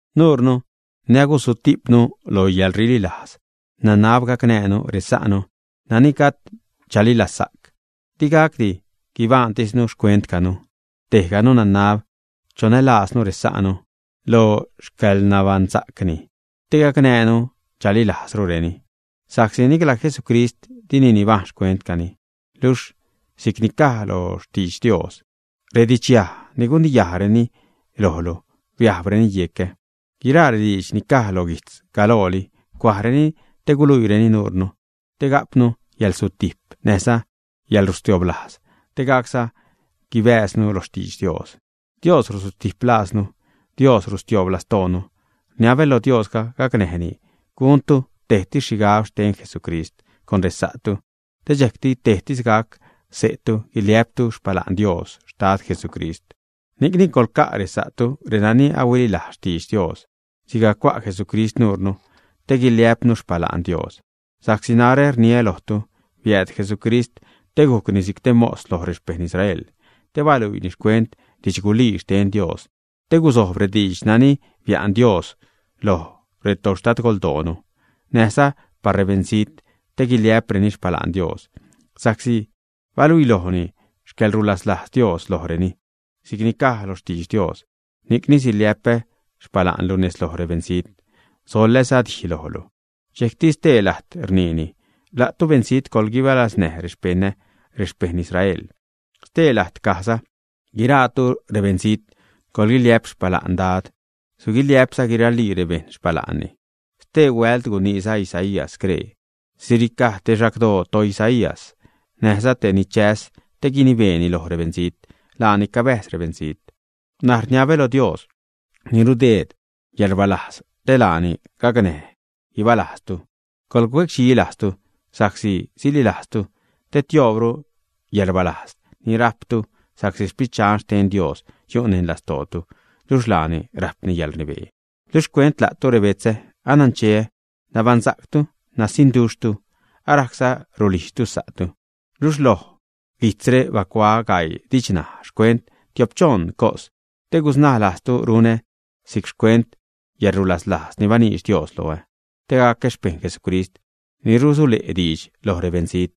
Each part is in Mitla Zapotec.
Nuurnu ni agusutijpnu lo yäḻrililajz nanab gacnäjnu resa'nu nani gajd chalilazsa'c. Di gacdi guibaṉtisnu xcuentcanu. Tejganu nanab chonälaaznu resa'nu lo xcäḻnabaṉsa'cni te gacnäjnu chalilajzrureni. Sa'csi nicla Jesucrist dini nibajṉ xcuentcani, luxh si'cni caj loj xtidx Dios: “Redidxyaj ni guniyajreni lojlu biajbreni yecä.” Guiraa rediidx ni cuaj lo guijtz galooli, cuajreni te guluiireni nuurnu te ga'pnu yäḻsutijp näjza yäḻrustioblajz te gacza guibääznu lo xtidx Dios. Dios rusutijp lajznu, Dios rutioob lastoonu. Rniabä loj Diosga gacnäjni guntu tejtis xhigab xten Jesucrist con resa'tu. Te dxejcti tejtis gac xse'tu guiliä'ptu xpala'n Dios, Xtad Jesucrist. Ni'cni coḻca' resa'tu, renani ahuililajz xtidx Dios sigajc cua' Jesucrist nuure te guiliä'pnu xpala'n Dios. Sa'csi narä rniä lojtu, biääd Jesucrist te gujcni si'c te mos loj rexpeṉ Israel te baluiini xcuent didxgulii xten Dios te gusojb rediidx nani bia'n Dios loj retoxtadgoldoonu, näjza par rebeṉzijt, te guliä'preni xpala'n Dios sa'csi baluilojni xcäḻrulaslajz Dios lojreni, si'c ni caj lo xtidx Dios: Ni'cni siliä'pä xpala'nlu nez loj rebeṉzijt, soḻäza dij lojlu. Dxejcti stee lajt rniini: La'tu beṉzijt, coḻguibalaznäj rexpeṉä rexpejṉ Israel. Stee lajt cajza: Guiraatu, rebeṉzijt, coḻguiliä'p xpala'n Dad, suguiliä'pza guiralii rebejṉ xpala'nni. Stee huält guniiza Isaías scree: Siricaj te xagdoo toIsaí, näjza te ni chäs te guinibeeni loj rebeṉzijt, laani cabäjz rebeṉzijt. N̲aj rniabä lo Dios ni rudeed yäḻrbäzlajz, te laani gacnäj guibalajztu, cuecdxilajztu, sa'csi salilajztu, te tioobru yäḻrbäzlajz ni rajptu sa'csi Sprit Dxan xten Dios yu' neṉ lastootu, luxh laani rajpni yäḻrnibee. Luxh xcuent la'tu rebetzä, anancheä nabaṉsa'ctu nasiṉduxhtu, arajcza rulijdxtu sa'tu, luxh loj guijtzre bacuaä gaii didxnaj xcuent tiop-choṉ cos, te gusnaä lajztu. Runä si'c xcuent yäḻrulaslajz ni baniidx Dios loä te gacä xpeṉ Jesucrist ni rusule' diidx loj rebeṉzijt.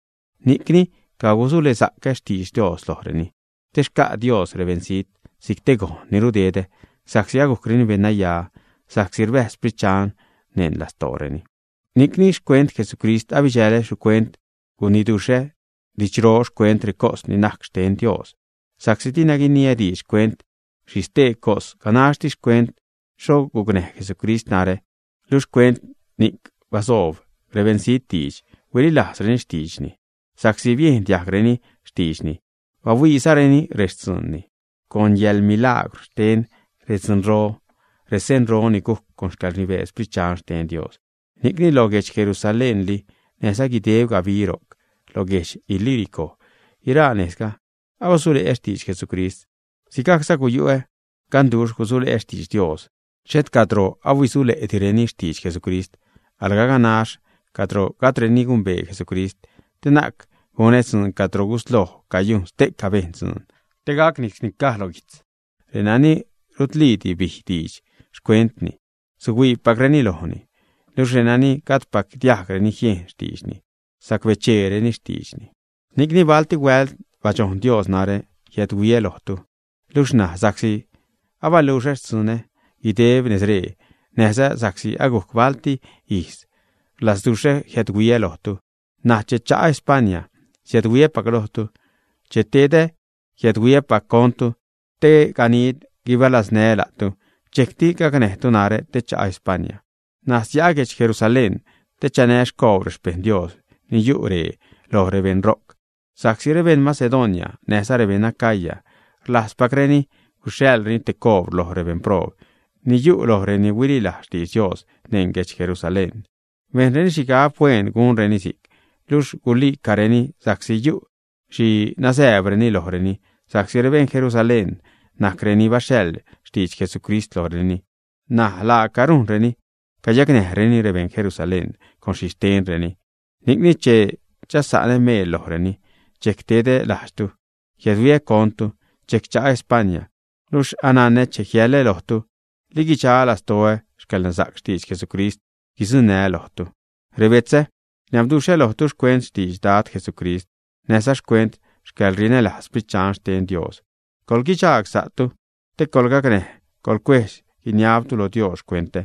Ni'cni cagusulesa'cä xtidx Dios lojreni, te xca' Dios rebeṉzijt si'c te gojn ni rudedä, sa'csi agujcreni beṉnaya sa'csi rbäjz Sprit Dxan neṉ lastooreni. Ni'cni xcuent Jesucrist abidxälä xhicuent guiniduxhä didxro xcuent recos ni najc xten Dios. Sa'csi dina guiniä diidx xcuent xhi stee cos, ganaxtis xcuent xho gucnäj Jesucrist narä, luxh xcuent ni'c basoob rebeṉzijt diidx, huililajzreni xtiidxni sa'csi biejn diajgreni xtiidxni, bahuiizareni rextzuunni, con yäḻmilaagwr xten redzunro, resenro, ni gujc con xcäḻrnibee Sprit Dxan xten Dios. Ni'cni lo guedx Jerusalénli, näjza guideb gabi ro'c, lo guedx Ilírico, guiraa nejzga abasule'ä xtidx Jesucrist. Si'cza guyu'ä ganduxh gusule'ä xtidx Dios xhet cadro ahuisule'direni xtidx Jesucrist, alga ganax cadro gajdreni gumbee Jesucrist, te na'c gunä dzuun cadro gusloj cayujn ste'ca bejṉ dzuun. Te gacni si'cni caj lo guijtz: Renani rutliidi bij diidx xcuentni, suhuiipacreni lojni, luxh renani gajdpac diajgreni jiejn xtiidxni, sacbecheereni xtiidxni. Ni'cni balti huält badxojn Dios narä jiädhuiä lojtu. Luxh ṉaj sa'csi abaluxä xtzunä guideb nezree, näjza sa'csi agujc balti ijz rlazduxhä jiädhuiä lojtu, ṉaj che cha'a España siädhuiäpac lojtu. Che tedä, jiädhuiäpac contu te ganid guibalaznää́ la'tu, dxejcti gacnäjtu narä te cha'a España. N̲aj sia'a guedx Jerusalén te chanää́ xcoobr rexpejṉ Dios ni yu' ree loj rebejṉ ro'c. Sa'csi rebejṉ Macedonia näjza rebeṉ Acaya rlajzpacreni guxhaḻreni te coobr loj rebeṉproob ni yu' lo reni huililajz xtidx Dios neṉ guedx Jerusalén. Bejnreni xhigab hueen gunreni si'c, luxh guli'careni, sa'csi yu' xhi nazääbreni lojreni sa'csi rebejṉ Jerusalén najc reni baxhaḻ xtidx Jesucrist lojreni, ṉaj laaca rujnreni cayacnäjreni rebeṉ Jerusalén con xhixtenreni. Ni'cni che chasa'nä meel lojreni dxejc tedä lajdxtu, jiädhuiä contu, dxejc cha'ä España. Luxh ananä che jiälä lojtu, li guidxa lastoä xcäḻnasa'c xtidx Jesucrist guidzuṉä lojtu. Rebetzä, rniabduxhä lojtu xcuent xtidx Dad Jesucrist näjza xcuent xcäḻrinälajz Sprit Dxan xten Dios, coḻguidxagsa'tu, te coḻgacnäj coḻcuedx-guiniabtu lo Dios xcuentä.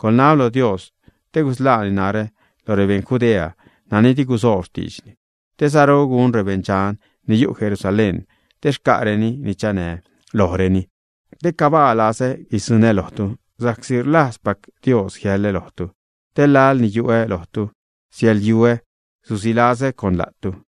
Coḻnab lo Dios te gusḻaani narä loj rebeṉ Judea nani di gusoob xtiidxni te saru gun rebeṉdxan ni yu' Jerusalén te xca'reni ni chanää́ lojreni. Te cabaa lazä guidzuṉä lojtu, sa'csi rlajzpac Dios jiälä lojtu, te laḻni yu'ä lojtu siäḻyuä, susilazäza con la'tu.